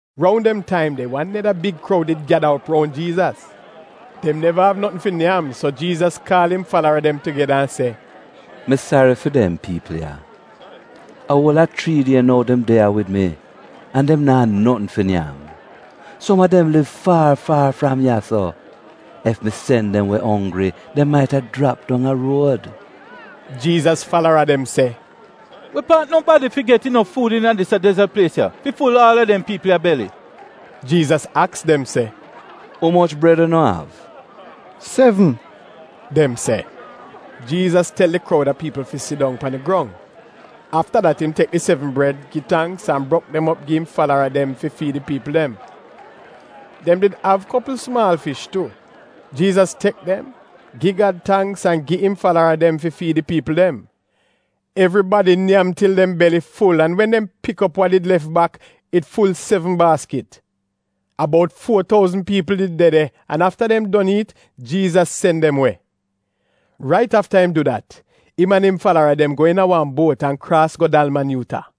Roun dem taim de wan neda big kroud did gyada op roun Jiizas. Dem neva av notn fi nyam, so Jiizas kaal im falara dem tugeda an se, “Mi sari fi dem piipl ya. A uol a chrii die nou dem de ya wid mi, an dem naa notn fi nyam. Som a dem liv far far fram ya-so. Ef mi sen dem we onggri dem maita jrap dong a ruod.” Jiizas falara dem se, “We paat nobadi fi get inof fuud iina dis ya dezot plies ya fi ful aal a dem piipl ya beli?” Jiizas aks dem se, “Umoch bred unu av?” “Sevn,” dem se. Jiizas tel di kroud a piipl fi sidong pan di grong. Afta dat im tek di sevn bred, gi tangks, an brok dem op gi im falara dem fi fiid di piipl dem. Dem did av kopl sumaal fish tu. Jiizas tek dem, gi Gad tangks an gi im falara dem fi fiid di piipl dem. Evribadi nyam til dem beli ful, an wen dem pik op wa did lef bak, it ful sevn baaskit. A bout fuo touzn piipl did de de an afta dem don iit, Jiizas sen dem we. Rait afta im du dat, im an im falara dem go iina wan buot an kraas go Dalmanyuuta.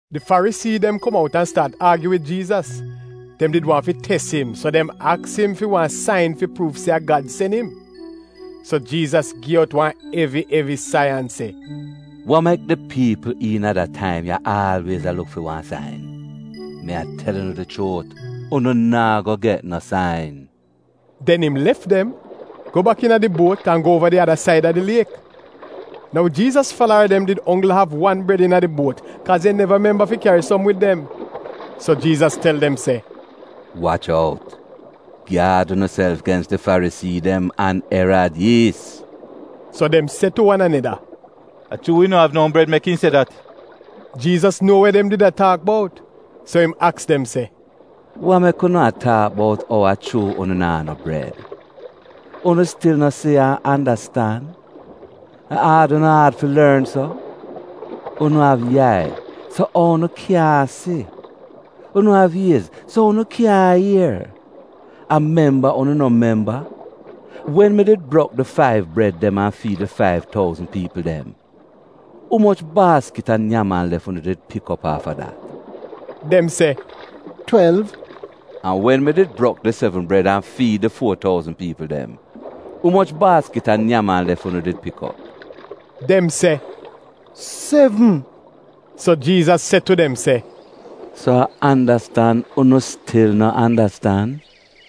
Di Farisii dem kom out an staat aagyu wid Jiizas. Dem did waahn fi tes im, so dem aks im fi wan sain fi pruuv se a Gad sen im. So Jiizas gi out wan evi evi sai an se, “Wa mek di piipl iina da taim ya aalwiez a luk fi wan sain? Mi a tel unu di chuut, unu naa go get no sain.” Den im lef dem, go bak iina di buot, an go uova di ada saida di liek. Nou Jiizas falara dem did onggl av wan bred iina di buot kaaz dem neva memba fi kyari som wid dem. So Jiizas tel dem se, “Wach out! Gyaad unuself gens di Farisii dem an Erad yiis.” So dem se tu wan aneda, “A chuu wi no av no bred mek im se dat.” Jiizas nuo wa dem did a taak bout, so im aks dem se, “Wa mek unu a taak bout ou a chuu unu naa no bred? Unu stil no si an andastan? A aad unu aad fi lorn so? Unu av yai, so ou unu kyaahn si? Unu av iez, so ou unu kyaahn ier? A memba unu no memba? Wen mi did brok di faiv bred dem an fiid di faiv touzn piipl dem, umoch baaskit a nyam-an-lef unu did pik op afta dat?” Dem se “Twelv.” “An wen mi did brok di sevn bred an fiid di fuo touzn piipl dem, umoch baaskit a nyam-an-lef unu did pik op?” Dem se, “Sevn.” So Jiizas se tu dem se, “So a andastan unu stil no andastan?”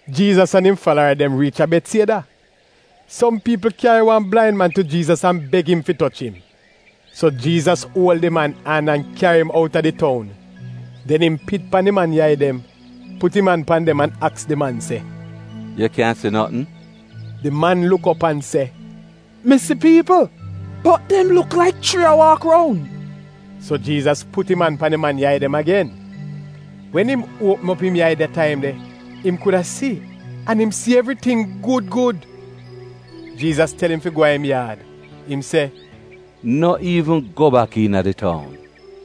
Jiizas an im falara dem riich a Betsieda. Som piipl kyari wan blain man tu Jiizas an beg im fi toch im. So Jiizas uol di man an an kyari im go outa di toun. Den im pit pan di man yai dem, put im an pan dem an aks di man se, “Yu kyan si notn?” Di man luk op an se, “Mi si piipl, bot dem luk laik chrii a waak roun.” So Jiizas put im an pan di man yai dem agen. Wen im uopm op im yai dem da taim de, im kuda si, an im si evriting gud gud. Jiizas tel im fi go a im yaad, im se, “No iivn go bak iina di toun.”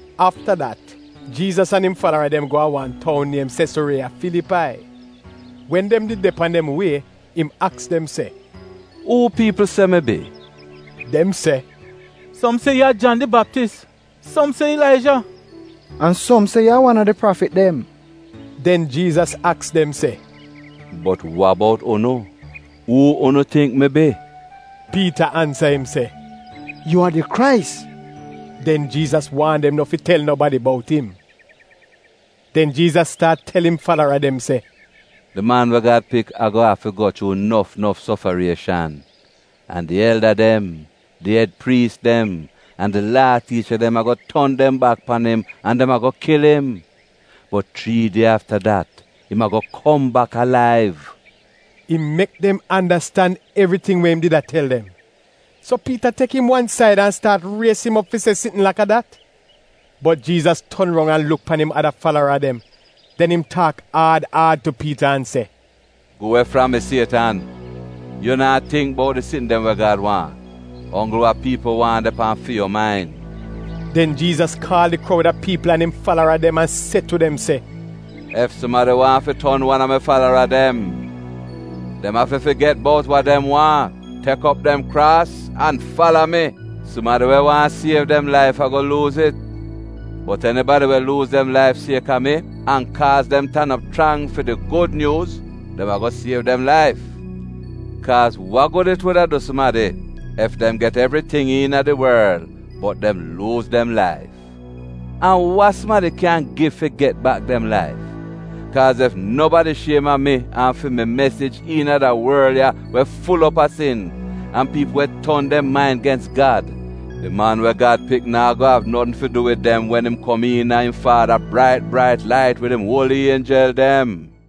Afta dat Jiizas an im falara dem go a wan toun niem Sesuriiya Filipai. Wen dem did de pan dem wie im aks dem se, “Uu piipl se mi bi?” Dem se, “Som se yu a Jan di Baptis, som se Ilaija, an som se yu a wan a di prafit dem.” Den Jiizas aks dem se, “Bot wa bout unu, uu unu tingk mi bi?” Piita ansa im se, “Yu a di Krais.” Den Jiizas waan dem no fi tel nobadi bout im. Den Jiizas staat tel im falara dem se, di Man we Gad Pik ago afi go chuu nof nof sofarieshan, an di elda dem, di ed priis dem, an di Laa tiicha dem ago ton dem bak pan im, an dem ago kil im. Bot chrii die afta dat, im ago kom bak alaiv. Im mek dem andastan evriting we im did a tel dem. So Piita tek im wan said an staat ries im op fi se sitn laka dat. Bot Jiizas ton roun an luk pan im ada falara dem, den im taak aad aad tu Piita an se, “Gu we fram mi Sietan! Yu naa tingk bout di sitn dem we Gad waahn, a onggl wa piipl waahn de pan fi yu main!” Den Jiizas kaal di kroud a piipl an im falara dem an se tu dem se, “Ef sumadi waahn fi ton wan a mi falara dem, dem afi figet bout wa dem waahn, tek op dem kraas, an fala mi. Sumadi we waahn siev dem laif ago luuz it, bot enibadi we luuz dem laif sieka mi an kaaz dem tan op chrang fi di Gud Nyuuz, dem ago siev dem laif. Kaaz wa gud it wuda du sumadi ef dem get evriting iina di worl bot dem luuz dem laif? An wa sumadi kyan gi fi get bak dem laif? Kaaz ef nobadi shiem a mi an fi mi mesij iina da worl ya we ful op a sin an piipl we ton dem main gens Gad, di Man we Gad pik naa go av notn fi du wid dem wen im kom iina im Faada brait brait lait wid im uoli ienjel dem.”